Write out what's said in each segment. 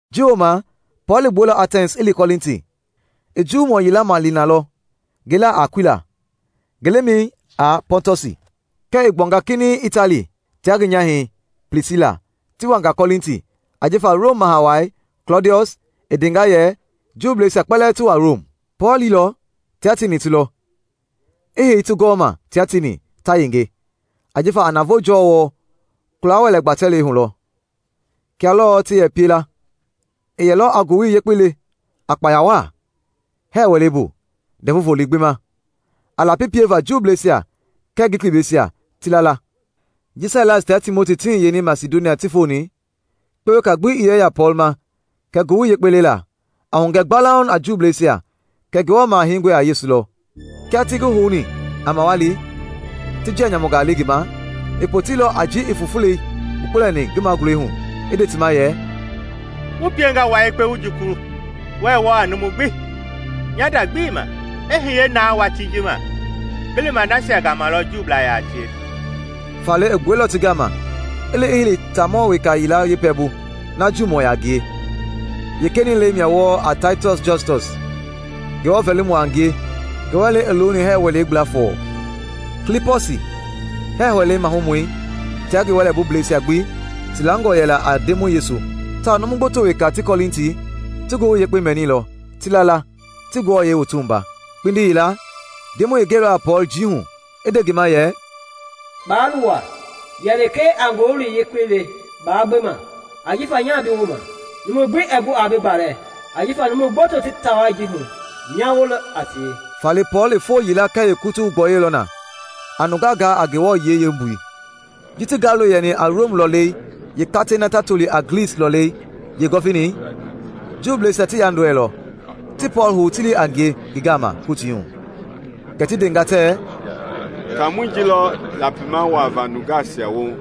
Ji wooma, Pɔɔl i gbuɛilɔ Atɛns i li Kɔlinti. I Juumɔ yila maleni na lɔ ngi laa a Akuila, ngi lemɛi a Pɔntɔsi, kɛɛ i gbuanga kinɛiŋ Itali tia ngi nyahɛi Plisila ti wanga Kɔlinti ajifa Rom Maha Wai Klɔdiɔs i ndenga yɛ Juuisia kpɛlɛɛ ti gbua Rom. Pɔɔl liilɔ tia tieni ti lɔ, i hei ti gɔɔma tia tieni ta yenge, ajifa a navoo jɔɔ wɔɔ kula-wɛlɛ gbatɛlɛi hu lɔ, kia lɔɔ ti yɛ pie la. I yɛlɔ a Ngowili Yekpei le a kpaya waa hɛɛ wɛlei bu Ndɛvu Volo gbi ma, a lapi pieva Juuisia kɛɛ Glikiblɛisia ti la la. Ji Sailas tia Timoti ti hiyeni Masidonia ti foni, kpewe weka ii yɛ yaa Pɔɔl ma kɛ Ngowili Yekpei lela, a hugɛ gbalauŋ a Juuisia kɛ Ngewɔ Maha Heingɔi a Yesu lɔ. Kia ti ngi houni a mawali ti njia nyamungaa le ngi ma, i poteilɔ a ji i fufulei gbukpulɛni ngi magulɛi hu i nde ti ma yɛ, “Wu piengaa wua yekpe wu jukulu, wɛɛ wɔɔ a numu gbi! Nya nda gbii ma. I hiye na watii ji ma, ngi lima nasia gama lɔ Juublaa yaa tie.” Faale i gbuɛilɔ ti gama i li i hei taamɔ weka yila yeepɛlɛbu na Juumɔɔ yaa ngie. Yeekenɛi lɛi mia wɔɔ a Taitiɔs Justɔs, Ngewɔ vɛlimɔ a ngie, ngi wɛlei i looni hɛɛ wɛlei gbla fɔɔ. Klipɔsi, hɛɛ wɛlei mahumɔi tia ngi wɛlɛbubleisia gbi ti langɔ yɛla a Ndemɔi Yesu; tawao numu gboto weka ti Kɔlinti ti Ngowili Yekpei mɛnilɔ, ti la la, ti ti wua. Kpindi yila, Ndemɔi i gɛilɔ a Pɔɔl njii hu i nde ngi ma yɛ, “Baa luwa, yɛ lekee a Ngowili Yekpei le baa gbe ma, ajifa nya bi wooma. Numu gbi ɛɛ gu aa bi gbalɛ, ajifa numu gboto ti taa wai ji hu nya woo lɔ a tie.” Faale Pɔɔl i foo yila kɛɛ yeekutu gbɔyɔilɔ na a nungaa gaa a Ngewɔ yiɛi yeembui. Ji ti Galio yɛni a Rom lɔlei yeekakɛi na ta toli a Glis lɔɔlɛi yeegɔvinei, Juuisia ti yandɔɛilɔ, ti Pɔɔl hou ti li a ngie ngi gama Kotii hu. Kɛ ti ndenga tɛɛ, “Taamɔi ji lɔ lapima wuava nungaa woohu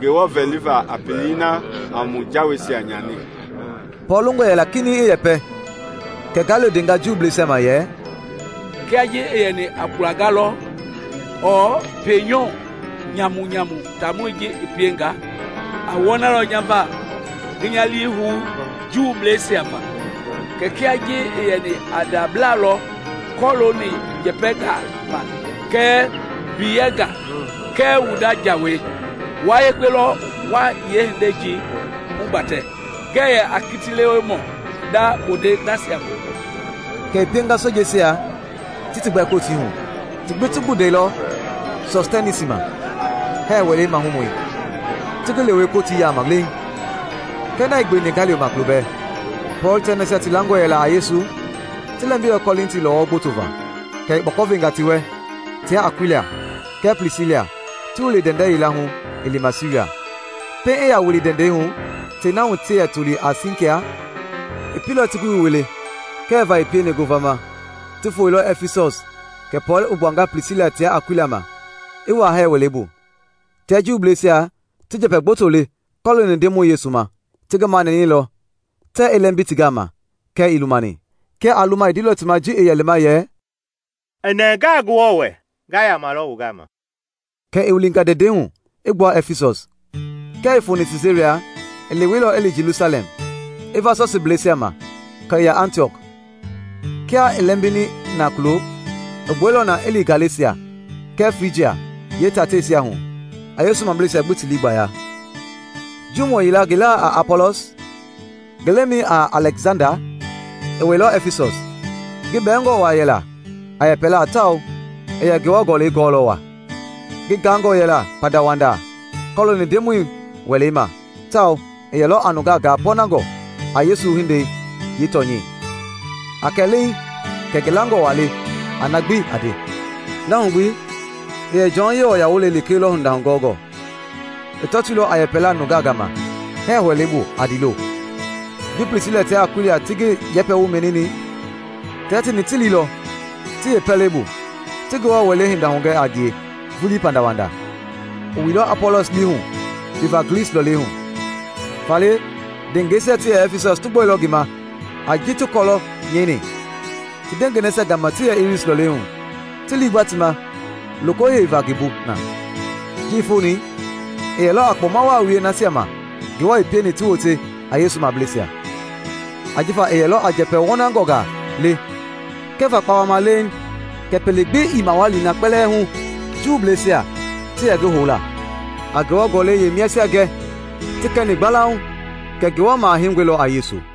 Ngewɔ vɛliva a pelei na a mu jawei nyani!” Pɔɔl longɔ yɛla kinɛiŋ i yɛpɛ kɛɛ Galio ndenga Juuisia ma yɛ, “Kiaa ji i yɛni a kpulanga lɔ ɔɔ pienyɔu nyamunyamu taamɔi ji i pienga, aa wɔnalɔ nya va ngi nya lii hou Juuisia va. Kɛɛ kia ji i yɛni a ndabla lɔ kɔlooni njɛpɛngaa ma kɛɛ mbiyɛngaa kɛɛ wu nda jawei, wua yekpe lɔ wa yeehindei ji hugbatɛ. Ngɛɛ yɛ a kitilewemɔ hinda bondei nasia ma!” Kɛ i pienga sojeisia ti ti gbɛ Kotii hu. Ti gbi ti gbundɛilɔ Sɔstɛnisi ma, hɛɛ wɛlei mahumɔi, ti ngi lewe Kotii yaama leeŋ. Kɛɛ na ii gbeweni Galio ma kulobɛɛ. Pɔɔl tia nasia ti langɔ yɛla a Yesu ti lɛmbilɔ Kɔlinti lɔwɔ gboto va, kɛ i kpɔkɔ venga ti wɛ, tia Akuila kɛɛ Plisila ti wili ndɛndɛ yila hu i lima Siria. Pɛiŋ i yaa wili ndɛndɛi hu tei na hu ti yɛ toli a Sɛnkia i pieilɔ ti ngi wui wole peele va pieni ngovama. Ti foeilɔ Ɛfisɔs kɛ Pɔɔl i gbuanga Plisila tia Akuila ma i wuaa hɛɛ wɛlei bu, tia Juuisia ti njɛpɛ gboto le kɔlooni Ndemɔi Yesu ma. Ti ngi manɛnɛilɔ tɛɛ i lɛmbi ti gama kɛɛ ii lumani. Kia aa luma i ndeilɔ ti ma ji i yɛ lima yɛ, “I nɛngaa Ngewɔ wɛ nga yamalɔ wu gama.” Kɛ i wilinga ndɛndɛi hu i gbua Ɛfisɔs. Kia i foni Siisaria, i leweilɔ i li Jelusalɛm, i va Sɔsiibleisia ma, kɛ i ya Antiɔk. Kia i lɛmbini na kulo, i gbuɛilɔ na i li Galesia kɛɛ Frijia yeetateisia hu a Yesu mableisia gbi ti lii gbaya. Juumɔ yila ngi laa a Apɔlɔs, ngi lemɛi a Alɛksanda, i wɛilɔ Ɛfisɔs. Ngi bɛɛngɔ waa yɛla a yɛpɛla tawao i yɛ Ngewɔ Gɔlɛi gɔɔlɔ waa. Ngi gaangɔ yɛla pandawanda kɔlooni Ndemɔi Welei ma tawao i yɛlɔ a nunga gaa pɔɔnangɔ a Yesu hindei yeetɔnyɛi, a kɛ leeŋ kɛ ngi langɔ waa le a na gbi a nde. Na hu gbi i yɛ Jɔn numu wualei lekee lɔ hinda hugɔngɔ. I tɔtoilɔ a yɛpɛla nungaa gama hɛɛ wɛlei bu a ndiilo. Ji Plisila tia Akuila ti ngi yɛpɛwoi mɛnini, tia tieni ti liilɔ ti yeepɛlɛbu, ti Ngewɔ Welei hinda hugɛ a ngie vulii pandawanda. I wuilɔ Apɔlɔs lii hu liva Glis lɔlei hu, faale ndewengeisia ti yɛ Ɛfisɔs ti gbɔilɔ ngi ma a ji ti kɔlɔ nyɛini ti ndewengei nasia gama ti yɛ lris lɔɔlɛi hu, ti liigba ti ma loko heiva ngi bu na. Ji i foni, i yɛlɔ a kpɔma waa wie nasia ma Ngewɔ i pieni ti wote a Yesu mableisia. Ajifa i yɛlɔ a njɛpɛ wɔnangɔngaa le kɛva kpawama leeŋ kɛ pele gbi ii mawali na kpɛlɛɛ hu Juuisia ti yɛ ngi hou la, a Ngewɔ Gɔlɛi yeemiasia gɛ ti kɛni gbalauŋ kɛ Ngewɔ Maha Heingɔi lɔ a Yesu.